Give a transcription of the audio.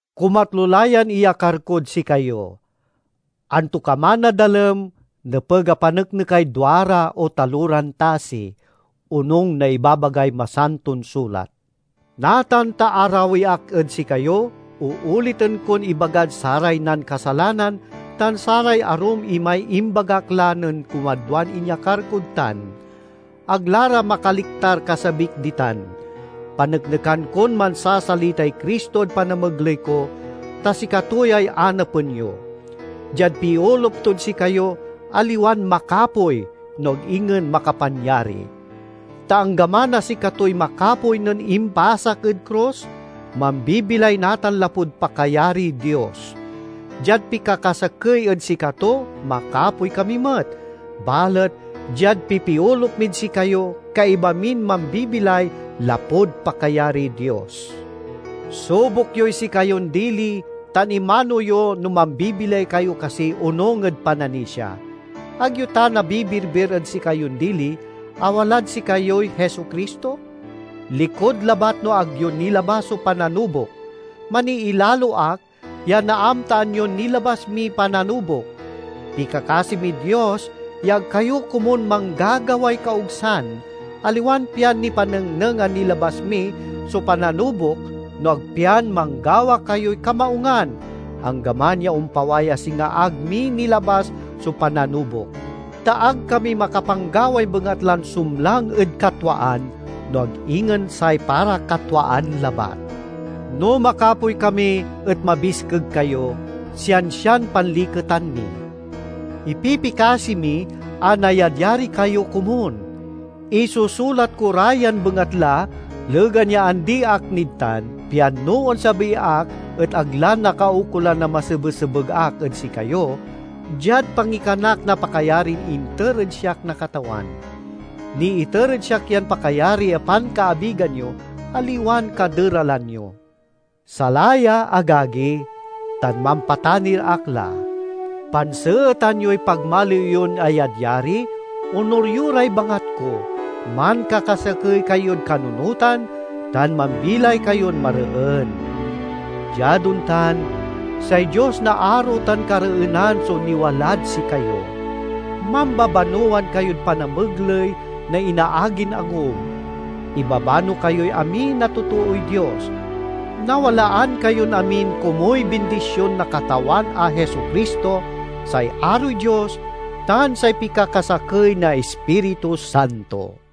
Kumatlo la yan iyakar kod sikayo. "Antokaman a dalem, nepeg a paneknekay duara o taloran tasi," onung na ibabagay Masanton Sulat. Natan ta arawi ak ed sikayo, ooliten kon ibagad saray nankasalanan tan saray arum imay imbagak la nen kumadwan inyakar kod tan: ag la ra makaliktar kasabik ditan. Paneknekan kon mansasalitay Cristo ed panamegley ko, ta sikato yay anapen yo. Diad piolup tod sikayo aliwan makapoy, no ag ingen makapanyari. Ta anggaman a sikatoy makapoy nen impasak ed krus, mambibilay natan lapud pakayariy Dios. Diad pikakasakey ed sikato makapoy kami met, balet diad pipiolup mid sikayo kaiba min mambibilay lapud pakayariy Dios. Subok yoy sikayon dili tan imano yo no mambibilay kayo kasi onung ed pananisia. Ag yo ta nabibirbir ed sikayon dili a walad sikayoy Jesu-Cristo?—likud labat no ag yo nilabas so pananubok. Maniilalo ak ya naamtaan yon nilabas miy pananubok. Pikakasi mid Dios ya ag kayo komun manggagaway kaogsan, aliwan pian nipanengneng a nilabas mi so pananubok, no ag pian manggawa kayoy kamaungan, anggaman ya ompaway a singa ag mi nilabas so pananubok. Ta ag kami makapanggaway bengatlan sumlang ed katwaan, no ag ingen say para katwaan labat. No makapoy kami et mabiskeg kayo, siansian panliketan mi. Ipipikasi mi a nayadyari kayo komun. Isusulat ko ra yan bengatla legan ya andi ak nid tan, pian no onsabi ak et ag la nakaukolan a masebesebeg ak ed sikayo, diad pangikanak na pakayarin inter ed siak na Katawan. Niiter ed siak yan pakayari a pankaabigan yo, aliwan kaderalan yo. Salaya, agagi, tan mampatanir ak la. Panseetan yoy pagmaliw yon ayadyari, onur yo ray bangat ko, mankakasakey kayod kanunotan, tan mambilay kayon mareen. Diad ontan, say Dios na aro tan kareenan so niwalad sikayo. Mambabanowan kayod panamegley na inaagin angub. Ibabano kayoy amin a totooy Dios. Nawalaan kayon amin komuy bindision na Katawan a Jesu-Cristo, say aroy Dios, tan say pikakasakey na Ispiritu Santo!